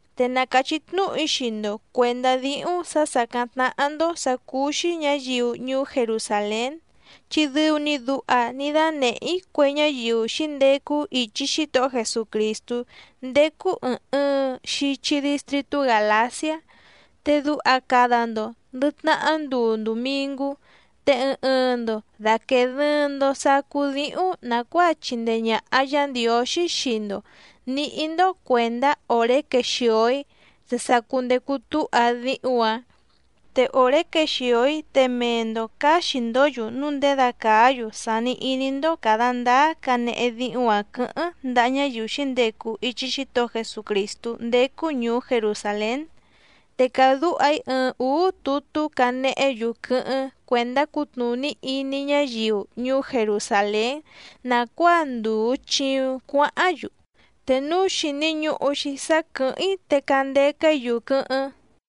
Te na càchí tnúhu‑í xii‑ndo cuèndá díhúⁿ sǎ sàcáⁿ tnáhá‑ndó sǎ cúú‑xí ñǎyiu ñuú Jerusàlén, chi dɨu‑ni duha ní dánèhé‑í cue ñáyiu xǐndecu ichi Xítohó Jesucrìstú ndécú ɨ̀ɨⁿ ɨɨⁿ xichi distritú Gàlaciá. Te duha cada‑ndo ndɨ̀ tnahá nduu ndumìngú, te ɨɨⁿ ɨɨⁿ‑ndo dàquee dɨɨⁿ‑ndo sacú díhúⁿ nàcuáa chìndee ñaha Yá Ndiǒxí xii‑ndo nìhí‑ndó cuèndá òré quexìo‑í te sa cundecu túha díhúⁿ‑ǎⁿ. Te òré quexìo‑í te mee‑ndo cǎxi‑ndǒ‑yu núu ndědacàa‑yu sàni iní‑ndó càda ndáá canehe díhúⁿ‑ǎⁿ quɨ̌hɨ́ⁿ ndaha ñáyiu xǐndecu ichi Xítohó Jesucrìstú ndécú ñùú Jerusàlén. Te cadúha‑í ɨɨⁿ ǔú tutú canehé‑yu quɨ́hɨ́ⁿ cuèndá cutnùní iní ñáyiu ñuú Jerusàlén nàcuáa ndùu chiuⁿ cuáháⁿ‑yu. Te núu xìni ñuhu‑xi sá quɨ̀hɨ́ⁿ‑í te candeca‑í‑yu quɨ́hɨ́ⁿ.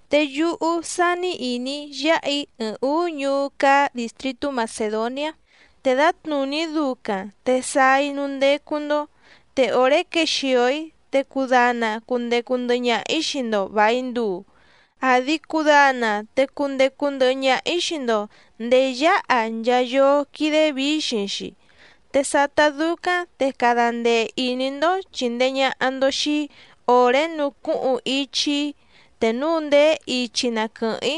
Te yúhú sání ìní‑í yáha‑í ɨɨⁿ ǔú ñuú cáá dìstritú Macèdoniá, te dǎtnùní ducaⁿ te sáá‑í núú ndécú‑ndó. Te òré quexìo‑í te cudana cundecu ndɨhɨ ñaha‑ǐ xii‑ndo vài nduu, àdi cudana te cundecu ndɨhɨ ñaha‑ǐ xii‑ndo ndèé yáha nchaa yóó quídé vǐxiⁿ‑xi. Te sátá dúcáⁿ te cada ndee ìní‑ndó chìndee ñaha‑ndo xii‑í òré nucúhuⁿ ichi‑í te núu ndèé ichi na quɨ̀hɨ́ⁿ‑í.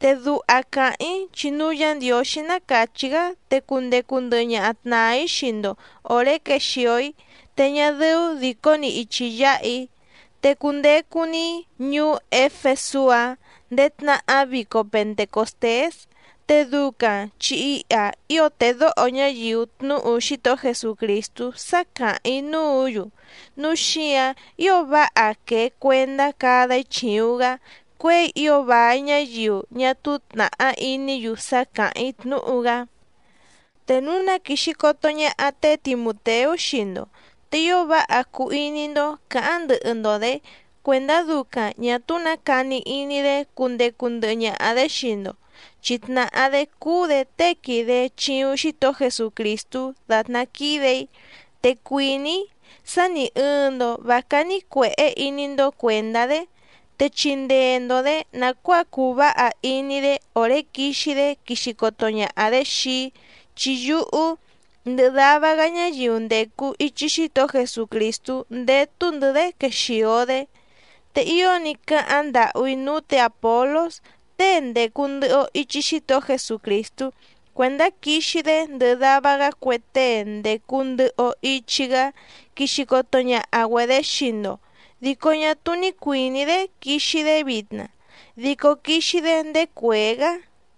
Te duha càháⁿ‑í chi núu Yá Ndiǒxí ná càchí‑gá te cundecu ndɨhɨ ñaha tnàa‑í xii‑ndo òré quexìo‑í te ñá dɨ́ú dìcó‑ni ichi yǎha‑í. Te cundecu‑ni‑í ñuú Éfesú‑a ndéé tnahá vico Pentecòstés. Te ducaⁿ chi iha ío tèdóho ñáyiu tnúhu Xítohó Jesucrìstú sá càháⁿ‑í núǔ‑yu. Núu xíǎⁿ ío váha quèe cuendá cada‑í chìuⁿ‑gá cuěi ío vài ñáyiu ñá túú tnàhá iní‑yu sá càháⁿ‑í tnúhu‑gá. Te núu na quìxi coto ñaha té Timùteú xii‑ndo, te ío váha cuu iní‑ndó cǎháⁿ ndɨhɨ‑ndo‑dě cuèndá ducaⁿ ñà túú nǎ cani iní‑dé cundecu ndɨhɨ ñaha‑dě xii‑ndo, chi tnàhá‑dé cúú‑dě tée quìde chiuⁿ Xítohó Jesucrìstú dàtná quídè‑í. Te cuìní‑í sá nì ɨɨⁿ‑ndo vá cání cuèhé iní‑ndó cuèndá‑dé, te chindee‑ndo‑dě nàcuáa cuu váha iní‑dé òré quixi‑dé quixi coto ñaha‑dě xii‑í, chi yúhú ndɨhɨ dava‑gá ñáyiu ndècu ichi Xítohó Jesucrìstú ndétú‑ndɨ̌‑dé quexìo‑dé. Te ío ní cáháⁿ ndàhú‑í núú tě Àpolós tée ndècu ndɨhɨ‑o ichi Xítohó Jesucrìstú cuèndá quixi‑dé ndɨhɨ dava‑gá cue tée ndècu ndɨhɨ‑o ichi‑gá quixi coto ñaha‑güedě xii‑ndo dico ñá túú ní cuìní‑dé quixi‑dé vitna, dico quixi‑dé ndéé cuèé‑gá.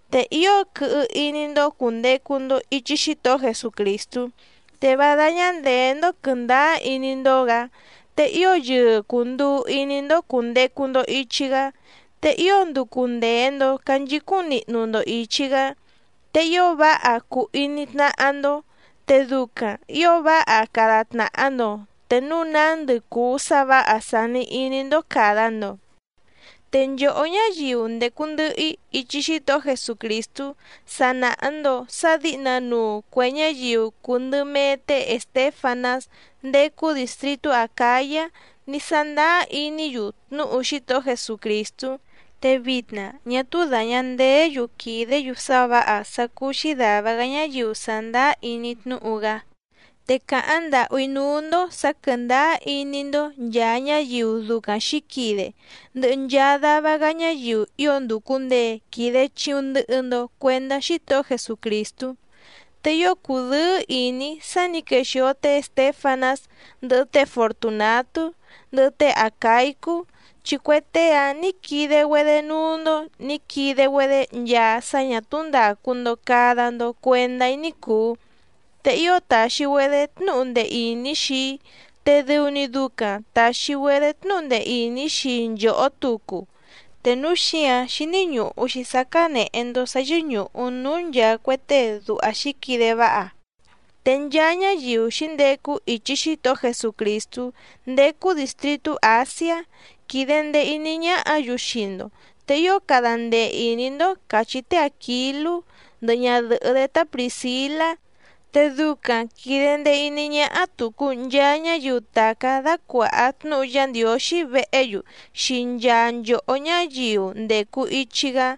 Te ío quɨhɨ iní‑ndó cùndecu‑ndo ichi Xítohó Jesucrìstú, te vá dáñá ndèé‑ndó quɨ̀ndáá iní‑ndó‑gǎ, te ío yɨɨ cùnduu iní‑ndó cùndecu‑ndo ichi‑gá, te ío nducu ndèe‑ndo canchicúⁿ nihnu‑ndo ìchi‑gá. Te ío váha cuu iní tnáhá‑ndó, te ducaⁿ ǐo váha cada tnàha‑ndo te núu nándɨ cùu sá vǎha sàni iní‑ndó càda‑ndo. Te nchòhó ñáyiu ndècu ndɨhɨ‑í ichi Xítohó Jesucrìstú sa nàha‑ndo sá dǐhnanuu cuè ñáyiu cùu ndɨ mee té Èstéfanás ndécú dìstritú Acǎyá ní sándáá iní‑yu tnúhu Xítohó Jesucrìstú. Te vitna ñá túú dàña ndeé‑yu quìdé‑yu sá vǎha sá cúú‑xí dàva‑gá ñáyiu sàndáá iní tnúhu‑gá. Te càháⁿ ndàhú‑í núú‑ndó sǎ quɨ̀ndáá iní‑ndó nchàa ñáyiu ducaⁿ xǐquide, ndɨhɨ nchaa dava‑gá ñáyiu ío ndùcu ndee quide chiuⁿ ndɨhɨ‑ndo cuendá Xítohó Jesucrìstú. Te ío cùdɨ́ɨ́ ìní‑í sá nǐ quexìo té Èstéfanás, ndɨhɨ té Fortunàtú, ndɨhɨ té Acàicú, chi cue tée‑áⁿ nǐ quide‑güedé núú‑ndó nǐ quide‑güedé nchaa sá ñà túú ndàcu‑ndo cada‑ndo cuendá‑í ní cùu. Te ío tàxi‑güedé tnúhu ndee ìní xii‑í, te dɨu‑ni ducaⁿ tàxi‑güedé tnúhu ndee ìní xii nchòhó tucu, te núu xíǎⁿ xíní ñùhu‑xi sá cánèhe‑ndo sá yɨ́ñùhu núú nchàa cue tée duha xǐquide váha. Te nchaa ñáyiu xǐndecu ichi Xítohó Jesucrìstú ndécú dìstritú Àsiá quìde ndee iní ñáhǎ‑yu xii‑ndo, te ío cada ndee ìní‑ndó càchí té Àquilú ndɨhɨ ñadɨ̀hɨ́‑dé tá Prìscilá, te ducaⁿ quìde ndee iní ñáhá tùcu nchaa ñáyiu tàcá dácuàha tnúhu Yá Ndiǒxí vehé‑yu xii nchaa nchòhó ñáyiu ndècu ichi‑gá.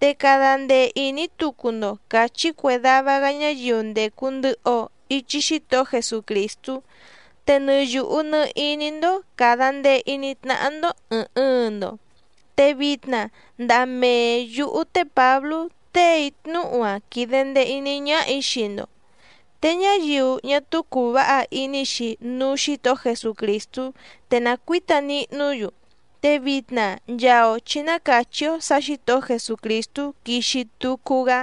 Te cada ndee ìní tucu‑ndo càchí cue dava‑gá ñáyiu ndècu ndɨhɨ‑o ichi Xítohó Jesucrìstú. Te nɨ yùhu nɨ iní‑ndó càda ndee iní tnáhá‑ndó ɨ̀ɨⁿ ɨɨⁿ‑ndo. Te vitna ndaha mee yǔhú té Pǎblú téè‑í tnúhu‑a quìde ndee iní ñáhà‑í xii‑ndo. Te ñáyiu ñá túú cùu váha iní‑xi núú Xǐtohó Jesucrìstú te na cuǐta nihnú‑yu. Te vitna nchaa‑o chǐ ná càchí‑ó sǎ Xǐtohó Jesucrìstú quixi tucu‑gá.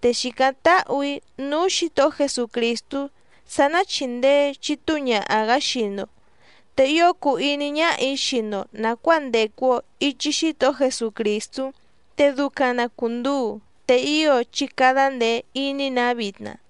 Te xìcáⁿ táhù‑í núú Xǐtohó Jesucrìstú sá ná chìndee chitúu ñaha‑gǎ xii‑ndo. Te ío cùu iní ñáhà‑í xii‑ndo nàcuáa ndècu‑o ichi Xítohó Jesucrìstú, te ducaⁿ na cùnduu, te ío chí cádá ndèe iní‑nǎ vitna.